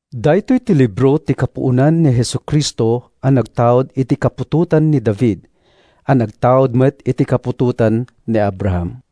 Daytoy ti libro ti kapuonan ni Jesu-Cristo a nagtaud iti kaputotan ni David, a nagtaud met iti kaputotan ni Abraham.